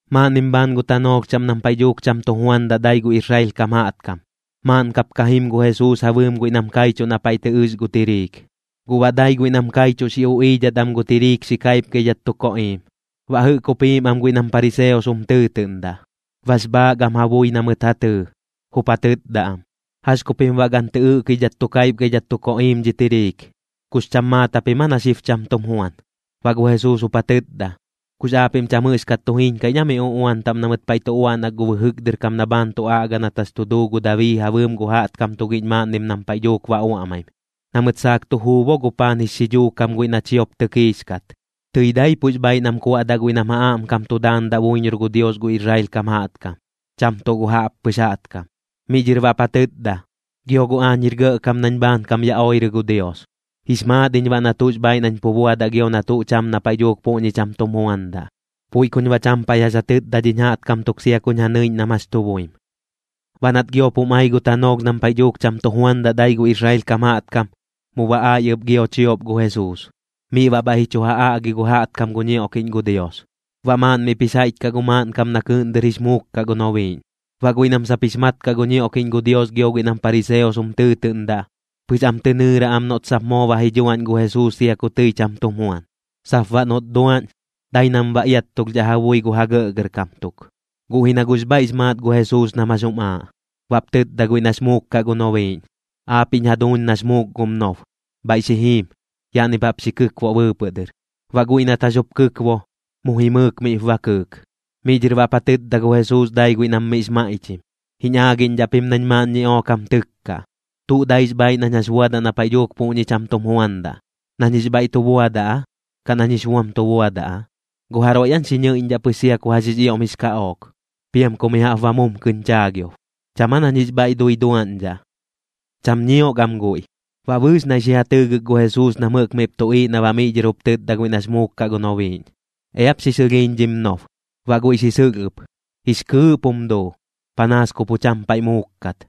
Maaꞌnnim bhaan gu tanoolh chaꞌm nam paiꞌ dhuuk cham tu juandaꞌ dai gu Israel kam jaꞌtkam, maaꞌn kap ka jim gu Jesuus ja bɨɨm guiꞌ nam kaichuꞌ na paiꞌ tɨ ɨx gu tiriik. Guꞌ baꞌ dai guiꞌ nam kaichuꞌ xi uꞌiidhat am gu tiriik xi kaipgaidhat tu koꞌiim. Baꞌ jɨꞌk jup jiim am guiꞌ nam pariseos jum tɨɨtɨꞌndaꞌ, bax bhaak am ja bui na mɨt ja tɨɨ, jup ja tɨtda am: ―¿Jax ku pim baꞌ gan tɨ ɨꞌkidhat tu kaipgaidhat tu koꞌiim dhi tiriik? ¿Kux cham maat japim aa na xib cham tum juan? Baꞌ gu Jesuus jup ja tɨtda: ―¿Kux aapiꞌm cham jɨꞌxkat tu jiñkaiꞌñ aa mi uꞌuan taꞌm na mɨt paiꞌ tu uaꞌnak gu bɨjɨk dɨr kam na bhaan tu aꞌga nat jax tu duu gu Dabii ja bɨɨm gu jaꞌtkam tugiꞌñ maaꞌnnim nam paiꞌ dhuuk ba uaꞌmaim? Na mɨt saak tu juu bo gu paan jix xidhuu kam guiꞌ na chiop tɨkiix kat. Tɨi daipuꞌx bhaaiꞌ nam kuaꞌdaꞌ guiꞌ nam ja aꞌmkam tu daandaꞌ buiñor gu Dios gu Israel kam jaꞌtkam, cham tuꞌ gu jaꞌppɨx jaꞌtkam. Miꞌ dhɨr baꞌp ja tɨtda: ―Gio guꞌ aañ jir gɇꞌkam nañ bhaankam ya oirɨ gu Dios, jix maat iñ baꞌ na tuꞌx bhaaiꞌ nañ pu buadaꞌ gio na tuꞌ cham na paiꞌ dhuuk puꞌñi cham tum juandaꞌ. Puiꞌ kuñ baꞌ cham paiꞌ jax ja tɨtda dhiñ jaꞌtkam tuk sia kuñ ja nɨiꞌñ nam jax tu buim. Baꞌ nat giop jum ai gu tanoolh nam paiꞌ dhuuk cham tu juandaꞌ dai gu Israel kam jaꞌtkam, mu ba ai ɨp gio chiop gu Jesuus, miꞌ baꞌ bhaiꞌ ji chu ja aꞌgi gu jaꞌtkam gu ñioꞌkiꞌñ gu Dios. Baꞌ maaꞌn miꞌp jix jaiꞌch kaꞌ gu maaꞌnkam na kɨɨꞌn dɨr jix muuk kaꞌ gu nobiiꞌñ. Baꞌ guiꞌ nam sap jix mat kaꞌ gu ñioꞌkiꞌñ gu Dios gio guiꞌ nam pariseos jum tɨɨtɨꞌndaꞌ, pɨx am tɨ nɨɨra am noꞌt sap moo ba ji dhuaꞌñ gu Jesuus sia ku tɨi cham tum juan. Sap baꞌ noꞌt duaꞌñ, dai nam ba iattulhdhaꞌ ja bui gu ja gɇꞌgɇrkam tuk. Guꞌ ji na guꞌx bhaiꞌx maat gu Jesuus nam jax jum aaꞌ, baꞌp tɨtda guiꞌ nax muuk kaꞌ gu nobiiꞌñ: ―Aapiꞌñ jaduuñ nax muuk gum nob, bhaiꞌ xi jim, yaꞌnip jaꞌp xi kɨkboꞌ bɨɨpɨꞌ dɨr. Baꞌ guiꞌ nat jax jup kɨkbo, mu jimɨɨk miꞌp ba kɨɨk. Miꞌ dhɨr baꞌp ja tɨtda gu Jesuus dai guiꞌ nam miꞌx maiꞌchim: ―Jiñ aagiꞌñdhaꞌ pim nañ maaꞌn ñiꞌook jam tɨkkaꞌ. ¿Tuꞌ daix bhaaiꞌ nañ jax buadaꞌ na paiꞌ dhuuk puꞌñi cham tum juandaꞌ? ¿Nañ jix bhaiꞌ tu buadaꞌ aa, kaꞌ nañ jix buam tu buadaꞌ aa? ¿Gu jaroiꞌ aañ xi ñɨiꞌñdhaꞌ pɨx sia ku jax jix ioꞌm jix kaꞌook, piam ku mi jaꞌp ba mumkɨñ chaagiob? ¿Cham aa nañ jix bhaiꞌ dui duaꞌñdhaꞌ? Cham ñiok am guiꞌ. Baꞌ bɨɨx naiꞌ xi ja tɨɨgɨk gu Jesuus nam jɨꞌk miꞌp tuꞌiiꞌ na baꞌ miꞌ dhɨr jup tɨtda guiꞌ nax muuk kaꞌ gu nobiiꞌñ: ―Eap xi sɨlhiiñ dhim nob. Baꞌ guiꞌ xi sɨlh ɨp, jix kɨɨꞌp jum duu, panaas ku pu cham paiꞌ muuk kat.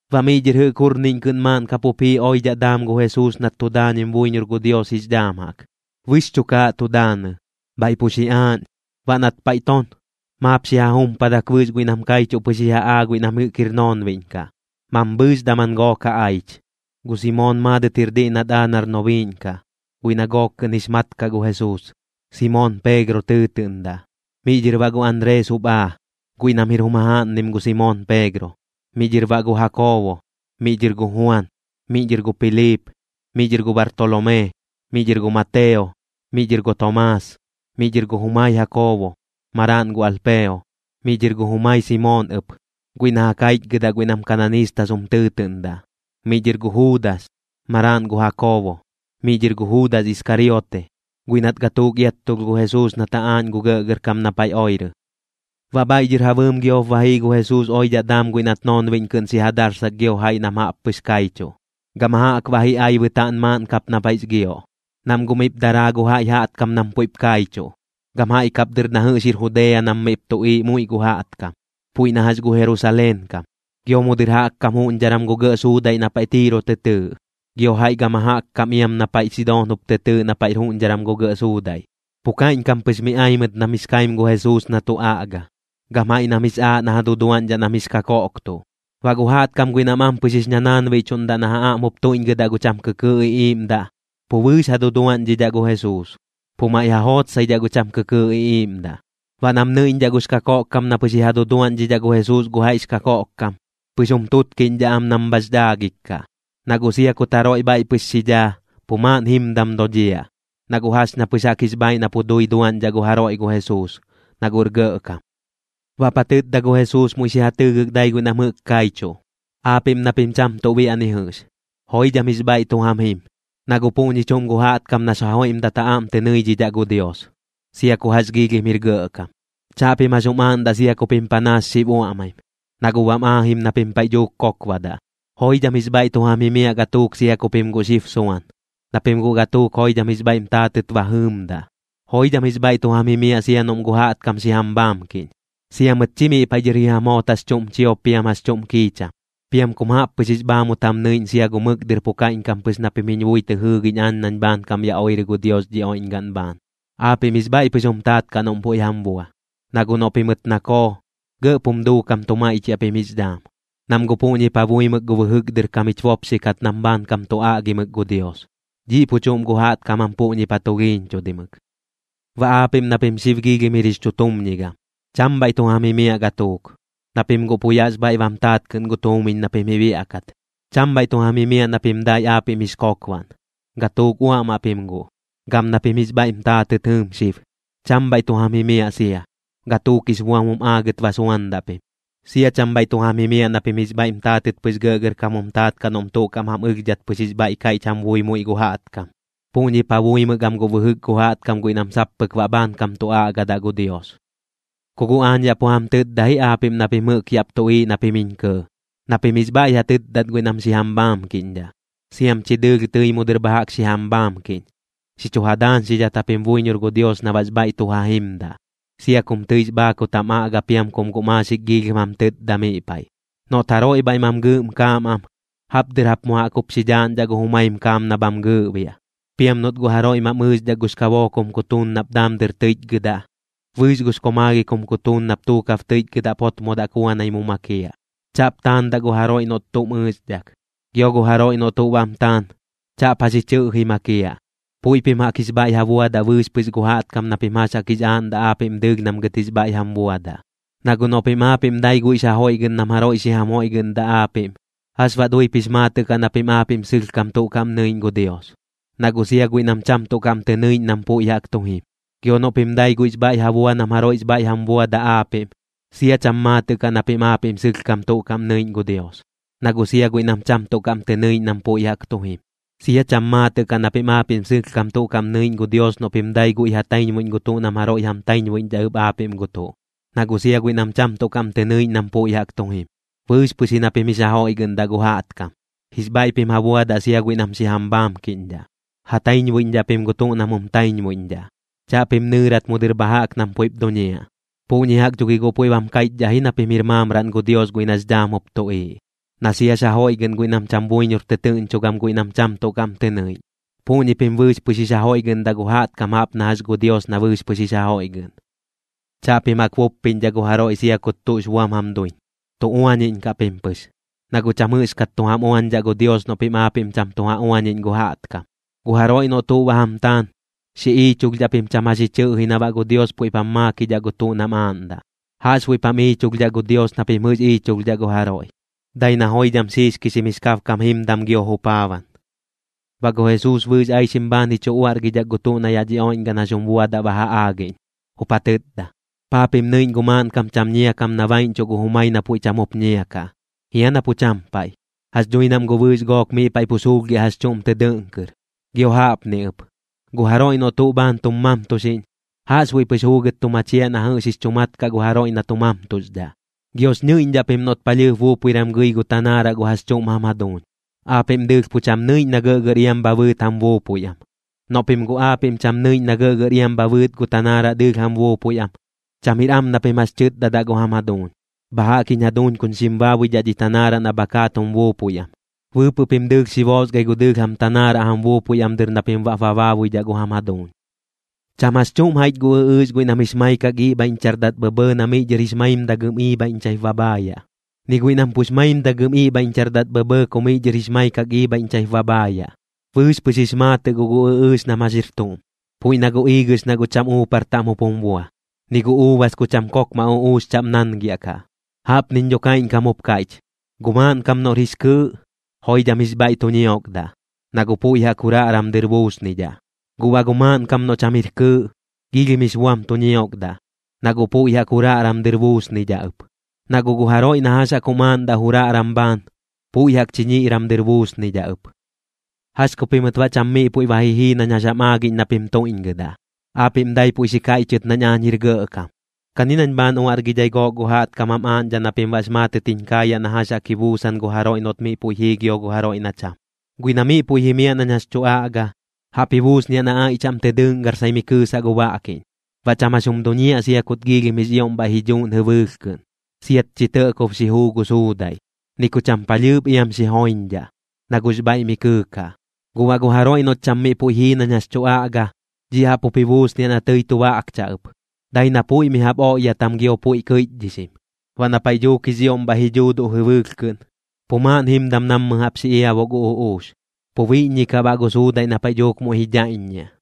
Baꞌ miꞌ dhɨr jɨꞌk jurniꞌñ kɨꞌn maaꞌn kap jup jii oidhaꞌ daam gu Jesuus nat tu daañim buiñor gu Dios jix dhaam jaꞌk. Bɨx chukaaꞌ tu daanɨ, bhaiꞌ pu xiꞌaaꞌñ. Baꞌ nat paiꞌ ton, maap xi ja jumpadak bɨɨx guiꞌ nam kaichuꞌ pɨx ji ja aa guiꞌ nam jɨꞌk jir noonbiꞌñ kaꞌ, mambhɨɨx daman gook ja aich. Gu Simoon maadɨt jir diꞌ nat aa nar nobiiꞌñ kaꞌ, guiꞌ na gook kɨꞌn jix mat kaꞌ gu Jesuus, Simoon Peegro tɨɨtɨꞌndaꞌ. Miꞌ dhɨr baꞌ gu Anrees jup aa, guiꞌ nam jir jum jajaaꞌnnim gu Simoon Peegro. Miꞌ dhɨr baꞌ gu Jakoobo. Miꞌ dhɨr gu Juan. Miꞌ dhɨr gu Piliip. Miꞌ dhɨr gu Bartolomee. Miꞌ dhɨr gu Mateo. Miꞌ dhɨr gu Tomaas. Miꞌ dhɨr gu jumai Jakoobo, maraaꞌn gu Alpeo. Miꞌ dhɨr gu jumai Simoon ɨp, guiꞌ na ja kaichgɨdaꞌ guiꞌ nam kananiistas jum tɨɨtɨꞌndaꞌ. Miꞌ dhɨr gu Juudas, maraaꞌn gu Jakoobo. Miꞌ dhɨr gu Juudas Iskariote, guiꞌ nat gatuuk iattulh gu Jesuus nat ja aaꞌñ gu gɇꞌgɇrkam na paiꞌ oirɨ. Baꞌ bhaiꞌ dhɨr ja bɨɨm giop ba jii gu Jesuus oidhaꞌ daam guiꞌ nat noonbiꞌñ kɨꞌn xi ja darsak gio gu jaiꞌ nam jaꞌp pɨx kaichuꞌ. Gama jaꞌk baꞌ ji ai bɨtaaꞌn maaꞌn kap na paiꞌx gioꞌ, nam guꞌ miꞌp daraa gu jaiꞌ jaꞌtkam nam puiꞌp kaichuꞌ, gam jaiꞌ kap dɨr na jɨꞌx jir Judea nam miꞌp tuꞌiiꞌ muiꞌ gu jaꞌtkam, puiꞌ na jax gu Jerusaleen kam, gio mu dɨr jaꞌk kam juꞌñdharam gu gɇꞌ suudaiꞌ na paiꞌ Tiiro tɨ tɨɨꞌ, gio jaiꞌ gama jaꞌk kam iam na paiꞌ Sidoon jup tɨ tɨɨꞌ na puiꞌp jir juꞌñdharam gu gɇꞌ suudaiꞌ. Pu kaiꞌñkam pɨx mi ai mɨt nam jix kaim gu Jesuus na tu aꞌga, gam jaiꞌ nam jix aaꞌ na ja duduaꞌñdhaꞌ nam jix kakoꞌktuꞌ. Baꞌ gu jaꞌtkam guiꞌ nam ampɨx jix ñanaanbiꞌchuꞌndaꞌ na ja aꞌm jup tuiꞌñgɨdaꞌ gu cham kɨkɨɨꞌ iꞌiiꞌmdaꞌ, pu bɨɨx ja duduaꞌñdhidhaꞌ gu Jesuus, pu maiꞌ ja jootsaidhaꞌ gu cham kɨkɨɨꞌ iꞌiiꞌmdaꞌ. Baꞌ nam nɨiꞌñdhaꞌ gux kakoꞌkkam na pɨx ji ja duduaꞌñdhidhaꞌ gu Jesuus gu jaiꞌx kakoꞌkkam, pɨx jum tutkiꞌñdhaꞌ am nam bhax dhaagik kaꞌ, na guꞌ sia kut jaroiꞌ bhaiꞌ pɨx xi dhaa, pu maaꞌn jimdam dodhiaꞌ, na guꞌ jax ña pɨx jaꞌk jix bhaaiꞌ na pu dui duaꞌñdhaꞌ gu jaroiꞌ gu Jesuus, na guꞌr gɇꞌkam. Baꞌp ja tɨtda gu Jesuus muiꞌ xi ja tɨɨgɨk dai guiꞌ nam jɨꞌk kaichuꞌ: ―Aapiꞌm na pim cham tuꞌ biaꞌ ni jɨꞌx, joidham jix bhaiꞌ tu jam jim, na guꞌ puꞌñi chuꞌm gu jaꞌtkam nax ja joiꞌmdat jam aꞌm tɨ nɨidhidhaꞌ gu Dios, sia ku jax jix ioꞌm jir gɇꞌkam. ’Chaꞌpim jax jum aaꞌndaꞌ sia ku pim panaas xib uaꞌmaim, na guꞌ bam aajim na pim paiꞌ dhuuk kokbadaꞌ. ’Joidham jix bhaiꞌ tu jam jimiaꞌ gatuuk sia ku pim guꞌ xib suan, na pim guꞌ gatuuk joidham jix bhaiꞌm taatɨt ba jɨɨmdaꞌ. ’Joidham jix bhaiꞌ tu jam jimiaꞌ sia noꞌm gu jaꞌtkam xi jam bhaamkiꞌñ, sia mɨt chi miꞌ paiꞌ dhɨr ji jam joot jax chuꞌm chiop piam jax chuꞌm kiicham, piam kum jaꞌp pɨx jix bhaamut jam nɨiꞌñ sia gu mɨk dɨr pu kaiꞌñkam pɨx na pim jiñ bui tɨ jɨɨgiꞌñ aañ nañ bhaankam ya oirɨ gu Dios dhi oiꞌñgaꞌn bhaan. Aapiꞌm jix bhaiꞌ pɨx jum taat kaꞌ noꞌm puiꞌ jam bua, na guꞌ noꞌ pimɨt nakoo, gɇꞌp jum duukam tu maiꞌchiaꞌ pim jix dhaam. Nam guꞌ puꞌñip ja buimɨk gu bɨjɨk dɨr kam jich bopxi kat nam bhaankam tu aꞌgimɨk gu Dios, dhiꞌ pu chuꞌm gu jaꞌtkam jam puꞌñip ja tulhiiñchudimɨk. ’Baꞌ aapiꞌm na pim xib giilhim jir jix chutumñigam, cham bhaiꞌ tu jam jimiaꞌ gatuuk, na pim guꞌ pu yaꞌx bhaiꞌ bam taat kɨꞌn gu tuumiñ na pim ji biaꞌkat. ’Cham bhaiꞌ tu jam jimiaꞌ na pim dai aapiꞌm jix kokbaꞌn, gatuuk uaꞌmaꞌ pim guꞌ. ’Gam na pim jix bhaiꞌm taatɨt jɨɨm xib, cham bhaiꞌ tu jam jimiaꞌ sia, gatuuk jix buam jum aagɨt ba suandaꞌ pim. ’Sia cham bhaiꞌ tu jam jimiaꞌ na pim jix bhaiꞌm taatɨt pɨx gɇꞌgɇrkam jum taat kaꞌ noꞌm tuꞌ kaꞌm jam ɨlhdhat pɨx jix bhaiꞌ kaiꞌch jam bui muiꞌ gu jaꞌtkam. Puꞌñip ja buimɨk am guꞌ bɨjɨk gu jaꞌtkam guiꞌ nam sap pɨk baꞌ bhaankam tu aꞌgadaꞌ gu Dios. ’Ku guꞌ aañ yaꞌ pu jam tɨtda ji aapiꞌm na pim jɨꞌk yaꞌp tuꞌiiꞌ na pim jiñ kɇɇ, na pim jix bhaiꞌ ja tɨtdat guiꞌ nam xi jam bhaamkiꞌñdhaꞌ, siam chi dɨɨlh tɨi mu dɨr bha jaꞌk xi jam bhaamkiꞌñ. Xi chu ja daañxidhat japim buiñor gu Dios na baꞌx bhaiꞌ tu ja jimdaꞌ, sia kum tɨix bhaakut jam aꞌga piam kum guꞌ maaxik giilhim jam tɨtda miꞌ paiꞌ. Noꞌt jaroiꞌ bhaiꞌ mam gɨɨꞌm kaam am, jaꞌp dɨr jap mu jaꞌk jup xi dhaaꞌñdhaꞌ gu jumaim kaam na bham gɨɨꞌbiaꞌ. Piam noꞌt guꞌ jaroiꞌ mam ɨɨxdhak gux kabook jum kutuun nap daam dɨr tɨiꞌchgɨdaꞌ, bɨɨx gux komaalhik jum kutuun nap tuukab tɨiꞌchgɨdaꞌp jotmodaꞌ kuanai mu makiaꞌ. Chaꞌp taandaꞌ gu jaroiꞌ noꞌt tuꞌm ɨɨxdhak. Gio gu jaroiꞌ noꞌ tuꞌ bam taan, chaꞌp jax ji chɨꞌji makiaꞌ. Puiꞌ pim jaꞌk jix bhaiꞌ ja buadaꞌ bɨɨx pɨx gu jaꞌtkam na pim jax jaꞌk jix aaꞌndaꞌ aapiꞌm dɨɨlh nam gɨt jix bhaiꞌ jam buadaꞌ. ’Na guꞌ noꞌ pim aapiꞌm dai guiꞌx ja joiꞌgɨꞌn nam jaroiꞌ xi jam joiꞌgɨꞌndaꞌ aapiꞌm, ¿jax baꞌ duip jix maatɨꞌ kaꞌ na pim aapiꞌm sɨlhkam tuꞌ kaꞌm nɨiꞌñ gu Dios? Na guꞌ sia guiꞌ nam cham tuꞌ kaꞌm tɨ nɨiꞌñ nam puiꞌ jaꞌk tu jim. Gio noꞌ pim dai guiꞌx bhaiꞌ ja bua nam jaroiꞌx bhaiꞌ jam buadaꞌ aapiꞌm, sia cham maatɨꞌ kaꞌ na pim aapiꞌm sɨlhkam tuꞌ kaꞌm nɨiꞌñ gu Dios, na guꞌ sia guiꞌ nam cham tuꞌ kaꞌm tɨ nɨiꞌñ nam puiꞌ jaꞌk tu jim. Sia cham maatɨꞌ kaꞌ na pim aapiꞌm sɨlhkam tuꞌ kaꞌm nɨiꞌñ gu Dios noꞌ pim dai guiꞌ ja taiñbuiꞌñ gu tuꞌ nam jaroiꞌ jam taiñbuiꞌñdhaꞌ ɨp aapiꞌm gu tuꞌ, na guꞌ sia guiꞌ nam cham tuꞌ kaꞌm tɨ nɨiꞌñ nam puiꞌ jaꞌk tu jim. Bɨɨx pɨx ji na pim jix ja joiꞌgɨꞌndaꞌ gu jaꞌtkam, jix bhaiꞌ pim ja buadaꞌ sia guiꞌ nam xi jam bhaamkiꞌñdhaꞌ. Ja taiñbuiꞌñdhaꞌ pim gu tuꞌ nam jum taiñbuiꞌñdhaꞌ, chaꞌpim nɨɨrat mu dɨr bha jaꞌk nam puiꞌp duñiaꞌ. Puꞌñi jaꞌk dho gi guꞌ puiꞌ bam kaiꞌchdhaꞌ ji na pim jir maamraꞌn gu Dios guiꞌ nax dhaam jup tuꞌiiꞌ, na siax ja joiꞌgɨꞌn guiꞌ nam cham buiñor tɨtɨɨꞌñcho gam guiꞌ nam cham tuꞌ kaꞌm tɨ nɨiꞌñ. Puꞌñi pim bɨɨx pɨx jix ja joiꞌgɨꞌndaꞌ gu jaꞌtkam jaꞌp na jax gu Dios na bɨɨx pɨx jix ja joiꞌgɨꞌn. ’Chaꞌpim jaꞌk buppiꞌñdhaꞌ gu jaroiꞌ sia kut tuꞌx buam jam duiñ, tu uañiꞌñkaꞌ pim pɨx, na guꞌ cham jɨꞌxkat tu jam uañdhaꞌ gu Dios noꞌ pim aapiꞌm cham tu ja uañiꞌñ gu jaꞌtkam. Gu jaroiꞌ noꞌ tuꞌ ba jam taan, xi iichulhdhaꞌ pim cham jax ji chɨꞌji na baꞌ gu Dios puiꞌp jam maakidhaꞌ gu tuꞌ nam aaꞌndaꞌ. Jaꞌxbuiꞌp jam iichulhdhaꞌ gu Dios na pim jɨꞌx iichulhdhaꞌ gu jaroiꞌ, dai na joidham xiixkixim jix kabkam jimdam gio jupaaban. Baꞌ gu Jesuus bɨɨx aixim bhaan ji chu uaꞌrgidhak gu tuꞌ na yaꞌ dhi oiꞌñgaꞌn jax jum buadaꞌ ba ja aagiꞌñ, jup ja tɨtda: ―¿Paa pim nɨiꞌñ gu maaꞌnkam cham ñia kam na baiꞌñchuꞌ gu jumai na puiꞌ cham jup ñia kaꞌ? Jia na pu cham paiꞌ. Jax dhui nam guꞌ bɨɨx gook miꞌ paiꞌ pu suulhgiaꞌ jax chuꞌm tɨ dɨꞌn kɨr. Gio jaꞌpni ɨp, gu jaroiꞌ noꞌ tuꞌ bhaan tum mamtuxiꞌñ, jaꞌxbuiꞌ pɨx juugɨt tu machiaꞌ na jɨꞌx jix chu mat kaꞌ gu jaroiꞌ na tu mamtuxdhaꞌ. ’Giox ñɨiꞌñdhaꞌ pim noꞌt palhɨɨp buupuiram gɨi gu tanaaraꞌ gu jax chuꞌm jam jaduuñ, aapiꞌm dɨɨlh pu cham nɨiꞌñ na gɇꞌgɇr iam bha bɨɨt jam buupui am. Noꞌ pim guꞌ aapiꞌm cham nɨiꞌñ na gɇꞌgɇr iam bha bɨɨt gu tanaaraꞌ dɨɨlh jam buupui am, cham jir am na pim jax tɨtdadaꞌ gu jam jaduuñ: “Bha jaꞌk jiñ jaduuñ kuñ xim baabuidhaꞌ dhi tanaaraꞌ na bha kaat jum buupui am.” Bɨɨpɨꞌ pim dɨɨlh xi boosgai gu dɨɨlh jam tanaaraꞌ jam buupui am dɨr na pim baꞌp ba baabuidhaꞌ gu jam jaduuñ. ’Cham jax chuꞌm jaiꞌch gu ɨꞌɨɨx guiꞌ nam jix maikak iꞌbhaiꞌñchardat bhɇbhɇɇ na miꞌ dhɨr jix maimdagɨm iibhaiꞌñchaip ba bhaayaꞌ, ni guiꞌ na pux maimdagɨm iꞌbhaiꞌñchardat bhɇbhɇɇ ku miꞌ dhɨr jix maikak iibhaiꞌñchaip ba bhaayaꞌ. Bɨɨx pɨx jix maatɨꞌ guꞌ gu ɨꞌɨɨx nam jax jir tuꞌm, puiꞌ na gu iigɨx na guꞌ cham uupar taꞌm jup jum bua, ni gu uubas ku cham kokmaꞌ uꞌuux chaꞌm nangiaꞌkaꞌ. Jaꞌpniñ dho kaiꞌñkam jup kaiꞌch, gu maaꞌnkam noꞌr jix kɨɨꞌ, joidham jix bhaiꞌ tu ñiokdaꞌ, na guꞌ puiꞌ jaꞌk juraꞌram dɨr buusnidhaꞌ. Guꞌ baꞌ gu maaꞌnkam noꞌ cham jir kɨɨꞌ, giilhim jix buam tu ñiokdaꞌ, na guꞌ puiꞌ jaꞌk juraꞌram dɨr buusnidhaꞌ ɨp. Na guꞌ gu jaroiꞌ na jax jaꞌk jum aaꞌndaꞌ juraꞌram bhaan, puiꞌ jaꞌk chiñiꞌram dɨr buusnidhaꞌ ɨp. ’¿Jax ku pimɨt baꞌ cham miꞌ puiꞌ ba ji jii nañ jax jam aagiꞌñ na pim tuiꞌñgɨdaꞌ? Aapiꞌm dai puiꞌ xi kaiꞌchɨt nañ aañ jir gɇꞌkam. Kani nañ bhaan uaꞌrgidhai gook gu jaꞌtkam jam aaꞌñdhaꞌ na pim baꞌx maatɨt jiñ kaayaꞌ na jax jaꞌk ji buusan gu jaroiꞌ noꞌt miꞌ puiꞌ jii gio gu jaroiꞌ na cham. Guiꞌ na miꞌ puiꞌ jimiaꞌ nañ jax tu aꞌga, jaꞌp ji buusniaꞌ na aiꞌ chaꞌm tɨ dɨꞌngarsai mi kɨɨsaꞌ gu baꞌkiꞌñ. Baꞌ cham jax jum duñiaꞌ sia kut giilhim jix ioꞌm bhaiꞌ ji dhuuꞌn jɨbɨɨlh kɨꞌn, siat chi tɇꞌkob xi juu gu suudaiꞌ. Ni ku cham palhɨɨp iam xi joiñdhaꞌ, na guꞌx bhaiꞌ mi kɨɨkaꞌ. Guꞌ baꞌ gu jaroiꞌ noꞌt cham miꞌ puiꞌ jii nañ jax tu aꞌga, dhiꞌ jaꞌp jup ji buusniaꞌ na tɨi tu baꞌkchaꞌ ɨp, dai na puiꞌ mi jaꞌp oꞌyatam gio puiꞌ kɨiꞌchdhixim. Baꞌ na paiꞌ dhuuk jix ioꞌm bhaiꞌ ji dhuuduꞌ jɨbɨɨlh kɨꞌn, pu maaꞌn jimdam nammɨ jaꞌp xi iabuꞌ gu uꞌuux, pu biꞌññikaꞌ baꞌ gu suudaiꞌ na paiꞌ dhuuk muiꞌ ji dhaiꞌññiaꞌ.